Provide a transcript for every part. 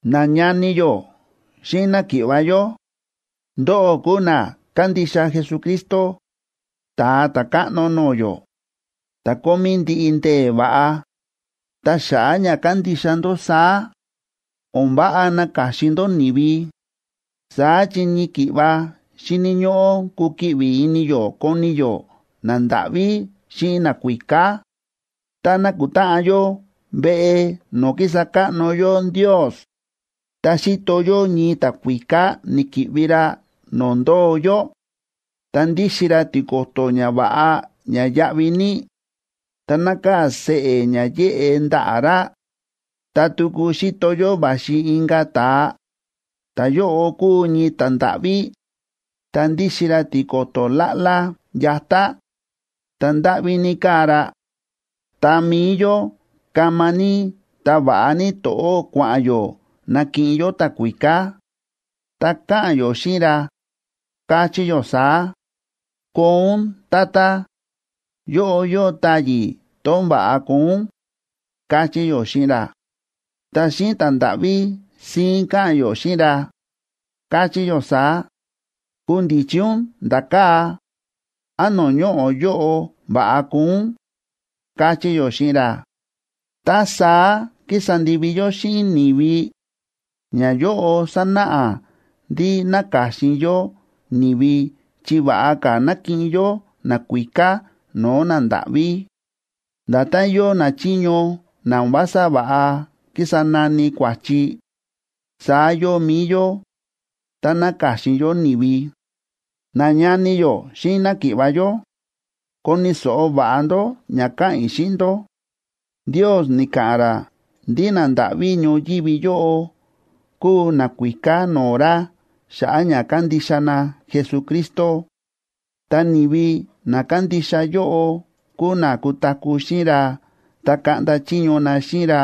Nañani yó xíꞌin náki̱ꞌva̱ yó, ndóꞌó kúu na kándixa Jesucristo, Ta̱a Ta̱káꞌno no̱o̱ yó, ta̱ kómí ndiꞌi ndee̱ va̱ꞌa. Ta xa̱ꞌa̱ ña kándixa ndó saá, o̱n váꞌa naka̱xin ndó ni̱vi, saá chi ñii ki̱ꞌva xíni̱ ñóꞌó kukiꞌvi ini yó koni yó nandáꞌví xíꞌin nakuíká. Tá nákutáꞌan yó veꞌe no̱o̱ kísa káꞌno yó Ndios, tá xíto yó ñii ta̱kuíká ni̱ki̱ꞌvi ra no̱o̱ ndóo yó, ta ndíxin ra tiko̱to̱ ña va̱ꞌa ña yáꞌví ní, ta nákaa̱ seꞌe̱ ña yéꞌe ndaꞌa̱ ra, ta tuku xíto yó va̱xi inka̱ ta̱a, ta̱yóꞌo kúu ñii ta̱ndáꞌví, ta ndíxin ra tiko̱to̱ láꞌlá yatá, ta ndáꞌví ní káa ra, ta mi̱i yó kama ní ta va̱ꞌa ní to̱ꞌó kua̱ꞌa̱n yó nakiꞌin yó ta̱kuíká, ta káꞌa̱n yó xíꞌin ra, káchí yó saá: “Koo ún, tata, yóꞌo yóo táyi̱ tón va̱ꞌa koo ún”, káchí yó xíꞌin ra. Ta xíꞌin ta̱ndáꞌví síín káꞌa̱n yó xíꞌin ra, káchí yó saá: “Kundichi ún nda̱ kaa̱, án no̱o̱ ñoꞌo̱ yóꞌo va̱ꞌa koo ún”, káchí yó xíꞌin ra. Tá saá kísa ndivi yó xíꞌin ni̱vi, ñayóꞌo sánáꞌa ndí náka̱xin yó ni̱vi chi va̱ꞌa ka̱ na̱kiꞌin yó nakuíká no̱o̱ nandáꞌví. Nda̱tán yóo nachiño na o̱n vása va̱ꞌa kísa nani kua̱chi, saá yóo mi̱i yó, tá náka̱xin yó ni̱vi. Nañani yó xíꞌin náki̱ꞌva̱ yó, koni̱ so̱ꞌo va̱ꞌa ndó ña káꞌa̱n i̱ xíꞌin ndó: Ndios ni̱ka̱ꞌa̱n ra ndí nandáꞌví ñoyívi yóꞌo kuu nakuíká no̱o̱ ra xa̱ꞌa̱ ña kándixa na Jesucristo. Ta ni̱vi na kándixa yóꞌo kúu na kutaku̱ xíꞌin ra ta kaꞌnda chiño na xíꞌin ra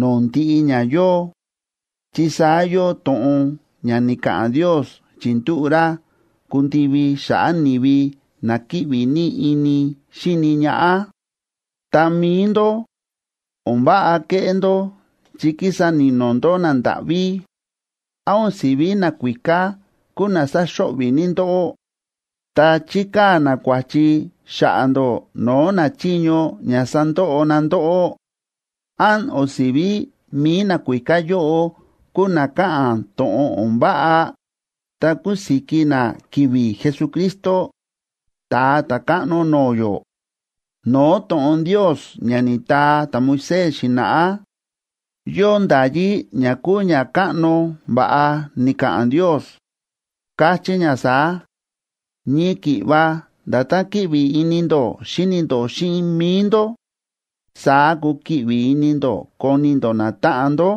no̱o̱ ndiꞌi ña yóo, chi saá yóo to̱ꞌon ña ni̱ka̱ꞌa̱n Ndios chi̱ndúꞌu̱ ra kundivi xa̱ꞌa̱ ni̱vi na kíꞌvi ní ini xíni ñaꞌá. Ta mi̱i ndó, o̱n váꞌa kéꞌé ndó chi kísa ni̱no̱ ndó nandáꞌví. ¿Án o̱n si̱ví nakuíká kúu na sáxo̱ꞌvi̱ ní ndóꞌó, ta chíkaa̱ na kua̱chi xa̱ꞌa̱ ndó no̱o̱ nachiño ña sandoꞌo na ndóꞌó? ¿Án o̱n si̱ví mi̱i nakuíká yóꞌo kúu na káꞌa̱n to̱ꞌon o̱n váꞌa ta kúsiki na ki̱vi̱ Jesucristo, Ta̱a Ta̱káꞌno no̱o̱ yó? No̱o̱ to̱ꞌon Ndios ña ni̱taa ta̱Moisés xi̱na̱ꞌá, yóo nda̱yí ña kúu ña káꞌno va̱ꞌa ni̱ka̱ꞌa̱n Ndios, káchí ña saá: “Ñii ki̱ꞌva nda̱tán kíꞌvi ini ndó xíni ndó xíꞌin mi̱i ndó, saá kukiꞌvi ini ndó koni ndó natáꞌan ndó.”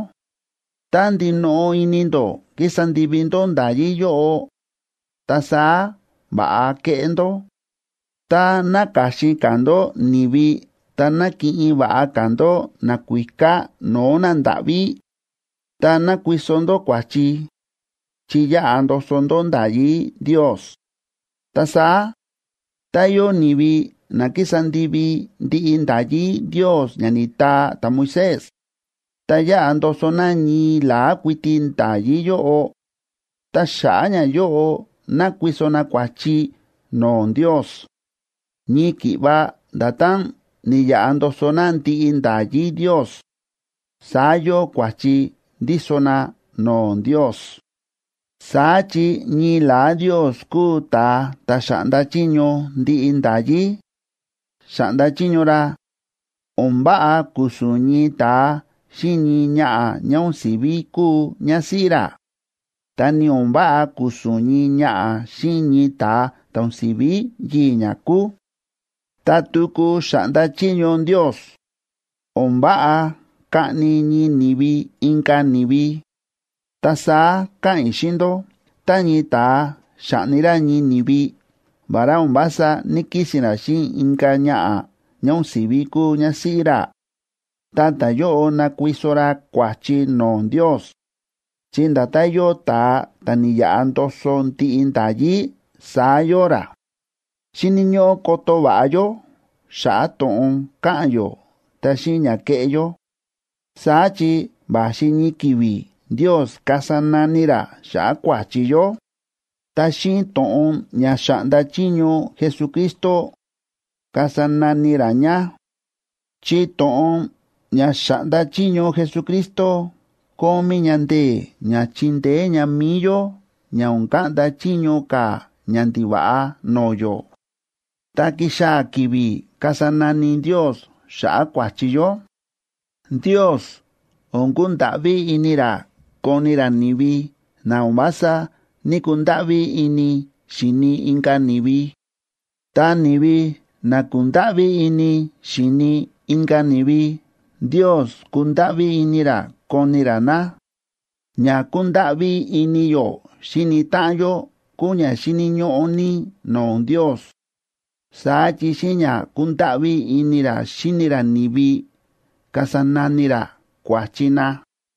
Tá ndinoꞌo ini ndó kísa ndivi ndó nda̱yí yóꞌo, ta saá va̱ꞌa kéꞌé ndó. Tá náka̱xin ka̱ ndó ni̱vi ta nákiꞌin va̱ꞌa ka̱ ndó nakuíká no̱o̱ nandáꞌví, ta nákuiso ndó kua̱chi, chi yáꞌa ndoso ndó nda̱yí Ndios. Ta saá, tá yóo ni̱vi na kísa ndivi ndiꞌi nda̱yí Ndios ña ni̱taa ta̱Moisés, ta yáꞌa ndoso na ñii la̱á kuiti nda̱yí yóꞌo, ta xa̱ꞌa̱ ñayóꞌo nákuiso na kua̱chi no̱o̱ Ndios. Ñii ki̱ꞌva nda̱tán ni̱yaꞌa ndoso na ndiꞌi nda̱yí Ndios, saá yóo kua̱chi ndíso na no̱o̱ Ndios. Saá chi ñii la̱á Ndios kúu ta̱a ta̱ xa̱ꞌnda chiño ndiꞌi nda̱yí. Xa̱ꞌnda chiño ra: “O̱n váꞌa ku̱su̱n ñii ta̱a xíꞌin ñii ñaꞌa̱ ñá o̱n si̱ví kúu ñásíꞌí ra, ta ni o̱n váꞌa ku̱su̱n ñii ñaꞌa̱ xíꞌin ñii ta̱a ta̱ o̱n si̱ví yii̱ ñá kúu.” Ta tuku xa̱ꞌnda chiño Ndios: “O̱n váꞌa kaꞌni ñii ni̱vi inka̱ ni̱vi.” Ta saá káꞌa̱n i̱ xíꞌin ndó, tá ñii ta̱a xa̱ꞌni ra ñii ni̱vi vará o̱n vása ní‑kisi̱n ra xíꞌin inka̱ ñaꞌa̱ ñá o̱n si̱ví kúu ñásíꞌí ra, ta ta̱yóꞌo nákuiso ra kua̱chi no̱o̱ Ndios, chi nda̱tán yóo ta̱a ta̱ ni̱yaꞌa ndoso ndiꞌi nda̱yí, saá yóo ra. Xíni̱ ñóꞌó koto va̱ꞌa yó xa̱ꞌa̱ to̱ꞌon káꞌa̱n yó ta xíꞌin ña kéꞌé yó. Saá chi va̱xi ñii ki̱vi̱ Ndios kasa nani ra xa̱ꞌa̱ kua̱chi yó. Ta xíꞌin to̱ꞌon ña xa̱ꞌnda chiño Jesucristo, kasa nani ra ña, chi to̱ꞌon ña xáꞌnda chiño Jesucristo kómí ña ndee̱ ña chindeé ña mi̱i yó ña o̱n kaꞌnda chiño ka̱ ñandiva̱ꞌa no̱o̱ yó. Ta kixaa̱ ki̱vi̱ kasa nani Ndios xa̱ꞌa̱ kua̱chi yó, Ndios o̱n kundáꞌví ini ra koni ra ni̱vi na o̱n vása ní‑kundáꞌví ini xi̱ni inka̱ ni̱vi. Ta ni̱vi na ku̱ndáꞌví ini xi̱ni inka̱ ni̱vi, Ndios kundáꞌví ini ra koni ra na. Ña kúndáꞌví ini yó xíni táꞌan yó kúu ña xíni̱ ñóꞌó ní no̱o̱ Ndios, saá chi xíꞌin ña kúndáꞌví ini ra xíni ra ni̱vi kasa nani ra kua̱chi na.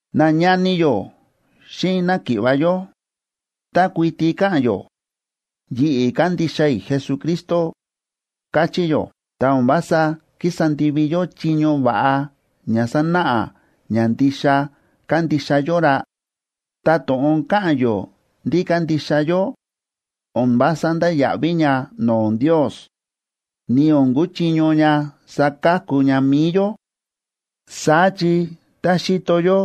Nañani yó xíꞌin náki̱ꞌva̱ yó, tá kuiti káꞌa̱n yó: “Yi̱ꞌi̱ kándixa i̱ Jesucristo”, káchí yó, ta o̱n vása kísa ndivi yó chiño va̱ꞌa ña sanáꞌa ña ndixa kándixa yó ra, ta to̱ꞌon káꞌa̱n yó ndí kándixa yó, o̱n vása ndáya̱ꞌví ña no̱o̱ Ndios, ni o̱n kuchiño ña saka̱ku ña mi̱i yó. Saá chi tá xíto yó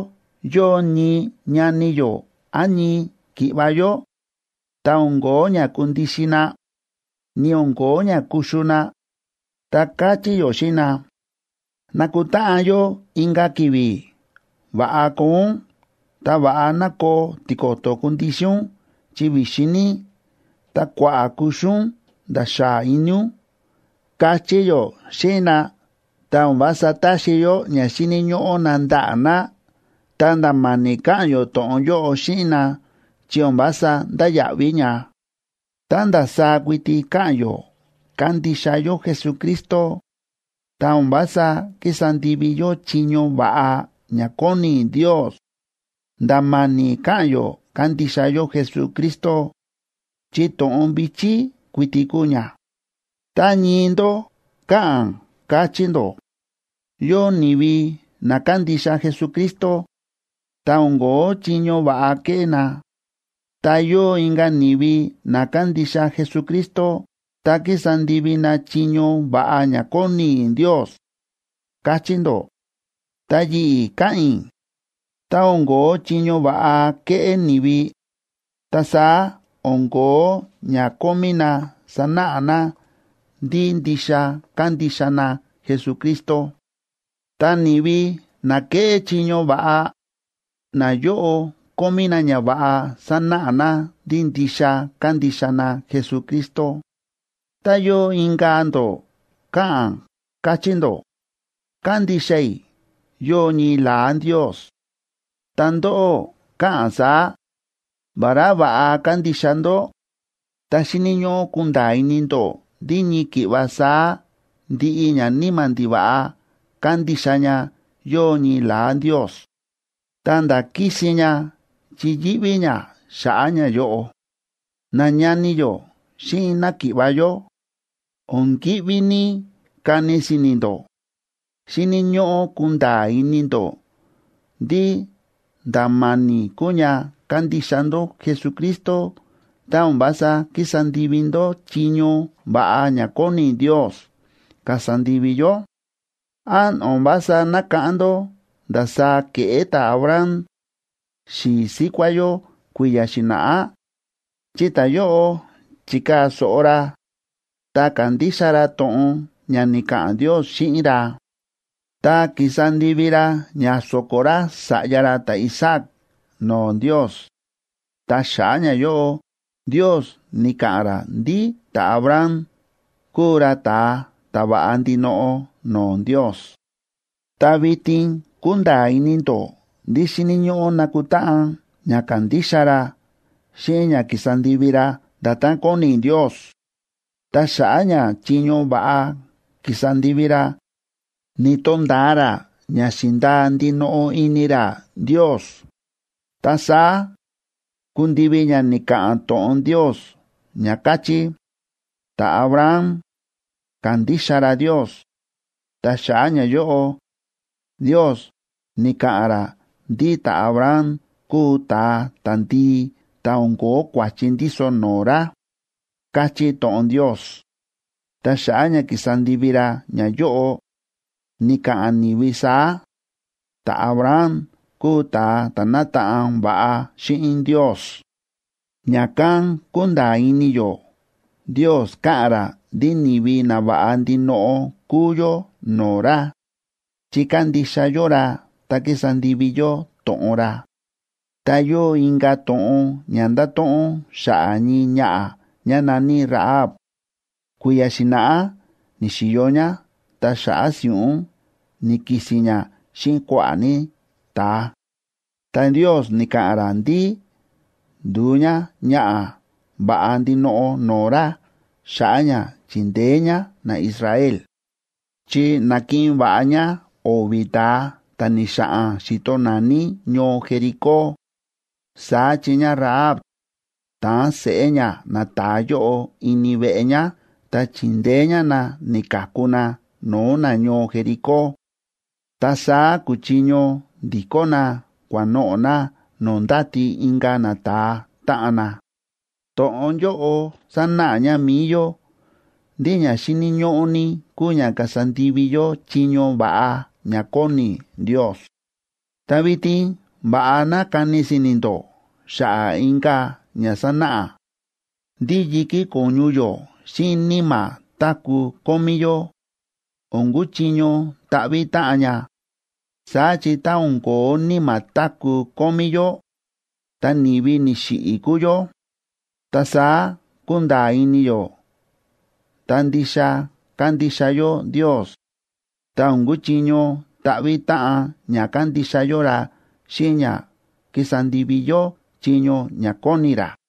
yóo ñii ñani yó án ñii ki̱ꞌva̱ yó, ta o̱n ko̱ó ña kundixin na, ni o̱n ko̱ó ña kuxu na, ta káchí yó xíꞌin na: “Nakutáꞌan yó inka̱ ki̱vi̱. Va̱ꞌa koo ún, ta va̱ꞌa ná koo tiko̱to̱ kundixin ún chi vi̱xin ní, ta kua̱ꞌa̱ kuxu ún nda̱ xaa ini ún”, káchí yó xíꞌin na, ta o̱n vása taxi yó ña xíni̱ ñóꞌó na ndaꞌa̱ na, ta nda̱ ma̱ni̱ káꞌa̱n yó to̱ꞌon yóꞌo xíꞌin na, chi o̱n vása ndáya̱ꞌví ña. Tá ndasaá kuiti káꞌa̱n yó kándixa yó Jesucristo, ta o̱n vása kísa ndivi yó chiño va̱ꞌa ña kóni Ndios, nda̱ ma̱ni̱ káꞌa̱n yó kándixa yó Jesucristo, chi to̱ꞌon vi̱chí kuiti kúu ña. Tá ñii ndó káꞌa̱n, káchí ndó: “Yóo ni̱vi na kándixa Jesucristo, ta o̱n ko̱ó chiño va̱ꞌa kéꞌé na. Ta yóo inka̱ ni̱vi na kándixa Jesucristo, ta kísa ndivi na chiño va̱ꞌa ña kóni Ndios”, káchí ndó. Ta yi̱ꞌi̱ káꞌa̱n i̱, tá o̱n ko̱ó chiño va̱ꞌa kéꞌé ni̱vi, ta saá o̱n ko̱ó ña kómí na sanáꞌa na ndí ndixa kándixa na Jesucristo. Ta ni̱vi na kéꞌé chiño va̱ꞌa, nayóꞌo kómí na ñava̱ꞌa sanáꞌa na ndí ndixa kándixa na Jesucristo. Tá yóo inka̱ ndó káꞌa̱n, káchí ndó: “Kándixa i̱ yóo ñii la̱á Ndios.” Ta ndóꞌó káꞌa̱n saá, vará va̱ꞌa kándixa ndó, ta xíni̱ ñóꞌó kunda̱a̱ ini ndó ndí ñii ki̱ꞌva saá ndiꞌi ñaníma̱ ndiva̱ꞌa kándixa ña yóo ñii la̱á Ndios, ta̱nda̱ kísin ña chi yíꞌví ña xa̱ꞌa̱ ñayóꞌo. Nañani yó xíꞌin náki̱ꞌva̱ yó, o̱n kíꞌví ní kani si̱ni̱ ndó. Xíni̱ ñóꞌó kunda̱a̱ ini ndó ndí nda̱ ma̱ni̱ kúu ña kándixa ndó Jesucristo tá o̱n vása kísa ndivi ndó chiño va̱ꞌa ña kóni Ndios kasa ndivi yó. ¿Án o̱n vása nákáꞌán ndó ndasaá ke̱ꞌé ta̱Abraham, xi̱i̱ síkuá yó kui̱ya̱ xi̱na̱ꞌá? Chi ta̱yóꞌo chi̱kaa̱ so̱ꞌo ra, ta ka̱ndixa ra to̱ꞌon ña ni̱ka̱ꞌa̱n Ndios xíꞌin ra, ta ki̱sa ndivi ra ña so̱ko̱ ra sa̱ꞌya ra ta̱Isaac no̱o̱ Ndios. Ta xa̱ꞌa̱ ñayóꞌo, Ndios ni̱ka̱ꞌa̱n ra ndí ta̱Abraham kúu ra ta̱a ta̱ va̱ꞌa ndinoꞌo no̱o̱ Ndios. Ta vitin kúnda̱a̱ ini ndó ndí xíni̱ ñóꞌó nakutáꞌan ña ka̱ndixa ra xíꞌin ña ki̱sa ndivi ra nda̱tán kóni Ndios, ta xa̱ꞌa̱ ña chiño va̱ꞌa ki̱sa ndivi ra, ni̱to̱nda̱a ra ña xi̱ndaa ndinoꞌo ini ra Ndios. Ta saá ku̱ndivi ña ni̱ka̱ꞌa̱n to̱ꞌon Ndios ña káchí: “Ta̱Abraham ka̱ndixa ra Ndios, ta xa̱ꞌa̱ ñayóꞌo, Ndios ni̱ka̱ꞌa̱n ra ndí ta̱Abraham kúu ta̱a ta̱ndii ta̱ o̱n ko̱ó kua̱chi ndíso no̱o̱ ra”, káchí to̱ꞌon Ndios. Ta xa̱ꞌa̱ ña ki̱sa ndivi ra ñayóꞌo, ni̱ka̱ꞌa̱n ni̱vi saá: “Ta̱Abraham kúu ta̱a ta̱ nátaꞌan va̱ꞌa xíꞌin Ndios.” Ña̱kán kúnda̱a̱ ini yó Ndios káꞌa̱n ra ndí ni̱vi nava̱ꞌa ndinoꞌo kúu yó no̱o̱ ra, chi kándixa yó ra ta kísa ndivi yó to̱ꞌon ra. Ta yóo inka̱ to̱ꞌon ña ndáto̱ꞌon xa̱ꞌa̱ ñii ñaꞌa̱ ñá na̱ní Rahab, kui̱ya̱ xi̱na̱ꞌá ni̱xi̱yo ñá ta xa̱ꞌa̱ si̱ꞌún ni̱ki̱si̱n ñá xíꞌin kua̱ꞌa̱ ní ta̱a. Ta Ndios ni̱ka̱ꞌa̱n ra ndí ndu̱u ñáñaꞌa̱ va̱ꞌa ndinoꞌo no̱o̱ ra xa̱ꞌa̱ ña chi̱ndeé ñá naIsrael; chi na̱kiꞌin va̱ꞌa ñá o̱vi̱ ta̱a ta̱ ni̱xa̱ꞌa̱n xíto naní ñoo Jericó. Saá chi ñáRahab ta̱an seꞌé ñá nata̱a yóꞌo ini veꞌe ñá, ta chi̱ndeé ñá na ni̱ka̱ku na no̱o̱ nañoo Jericó, ta saá ku̱chiño ndi̱kó na kua̱noꞌo̱ na no̱o̱ ndáti inka̱ nata̱a táꞌan na. To̱ꞌon yóꞌo sánáꞌa ña mi̱i yó ndí ña xíni̱ ñóꞌó ní kúu ña kasa ndivi yó chiño va̱ꞌa ña kóni Ndios. Ta vitin va̱ꞌa ná kani si̱ni̱ ndó xa̱ꞌa̱ inka̱ ña sánáꞌa, ndí yi̱kí ko̱ñu yó xíꞌin níma̱ táku̱ kómí yó, o̱n kuchiño ta̱ꞌvi̱ táꞌan ña, saá chi tá o̱n ko̱ó níma̱ táku̱ kómí yó, ta ni̱vi ni̱xiꞌi̱ kúu yó. Ta saá kúnda̱a̱ ini yó tá ndixa kándixa yó Ndios, ta o̱n kuchiño ta̱ꞌvi̱ táꞌan ña kándixa yó ra xíꞌin ña kísa ndivi yó chiño ña kóni ra.